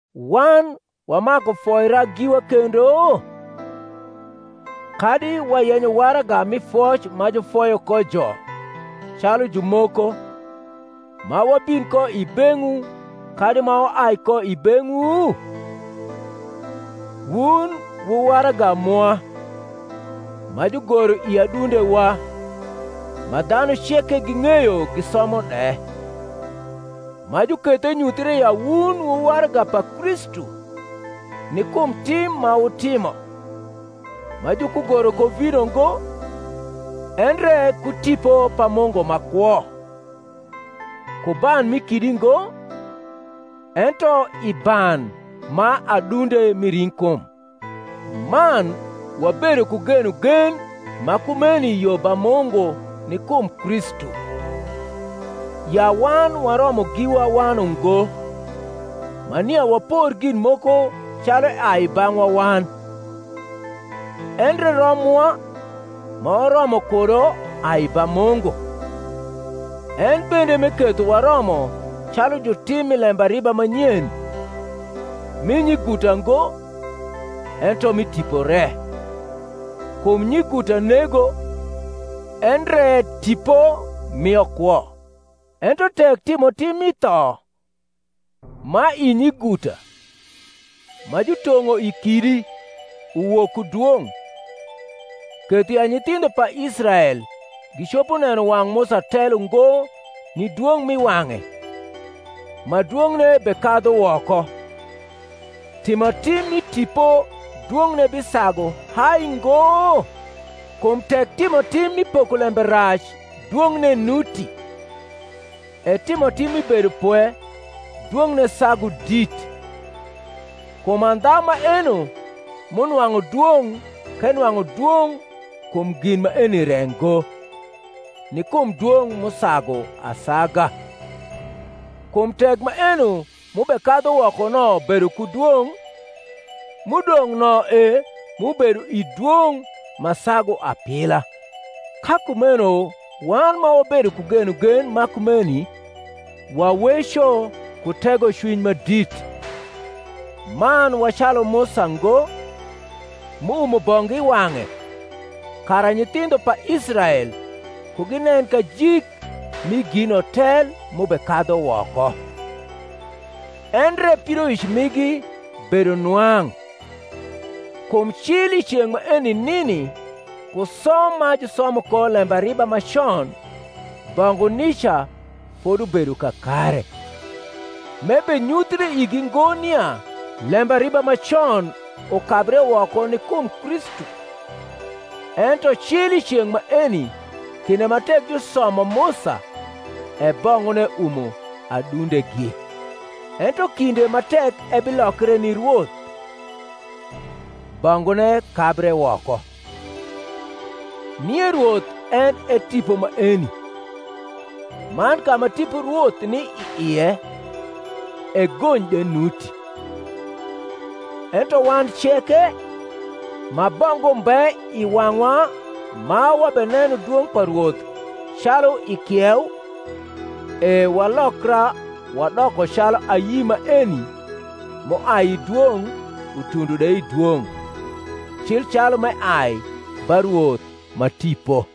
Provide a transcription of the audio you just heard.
Wan wamaku foira giwa kendo? kadi wayenyo waraga mi foc ma jufoyo ko jo, calu jumoko, ma wabin ko i beng’wu kadi ma waai ko i beng’wu? Wun wu waraga mwa, ma jugoro i adundewa, ma dhanu ceke ging’eyo gisomo de; ma juketho enyuthre ya wun wu waraga pa Kristu, ni kum tim ma watimo, ma jukugoro ku vino ngo, endre ku Tipo pa Mungu ma kwo; ku ban mi kidi ngo, ento i ban ma adunde mi ring’kum. Man wabedo ku genogen ma kumeni yo ba Mungu ni kum Kristu: ya wan waromo giwa wan ungo, ma nia wapor gin moko calu eai i bang’wa wan: endre rom mwa ma waromo kudo ai ba Mungu; en bende m’eketho waromo calu jutim mi lembariba ma nyen; mi nyiguta ngo, ento mi tipo re: kum nyiguta nego, endre ripo mio kwo. Ento tek timotim mi tho, ma i nyiguta, ma jutong’o i kidi, uwok ku dwong’, ketho ya nyithindho pa Israel gicopo neno wang’ Musa tel ungo ni dwong’ mi wang’e; ma dwong’ne bekadhu woko: timotim mi tipo dwong’ne bisagu hai ngo? Kum tek timotim mi pokolembe rac dwong’ne nuti, e timotim mi bedopwe dwong’ne sagu dit. Kum andha maeno m’unwang’u dwong’ k’enwang’u dwong’ kum gin maeni re ngo, ni kum dwong’ m’usagu asaga. Kum tek maeno m’ubekadhu woko no bedo ku dwong’, m’udong’ no e m’ubedo i dwong’ ma sagu apila. Ka kumeno wan ma wabedo ku genogen ma kumeni, waweco ku tegocwiny ma dit, man wa calu Musa ngo, m’uumo bongu i wang’e, kara nyithindho pa Israel ku ginen kajik mi gino tel m’ubekadhu woko: endre pidoic migi bedo nwang’: kum cil i ceng’ maeni nini ku som ma jusomo ko lembariba ma con bongu nica fodubedo kakare, m’ebenyuthre igi ngo nia lembariba ma con ukabre woko ni kum Kristu. Ento cil i ceng’ maeni, kinde ma tek jusomo Musa, e bongune umo adundegi. Ento kinde ma tek ebilokre ni Rwoth, bongune kabre woko. Nie Rwoth en e Tipo maeni: man ka ma Tipo Rwoth ni i ie, e gony de nuti. Ento wan ceke, ma bongu mbe i wang’wa ma wabeneno dwong’ pa Rwoth calu i kieu, e walokra wadoko calu ayi maeni m’uai i dwong’ utundo de i dwong’, cil calu m’eai ba Rwoth ma Tipo.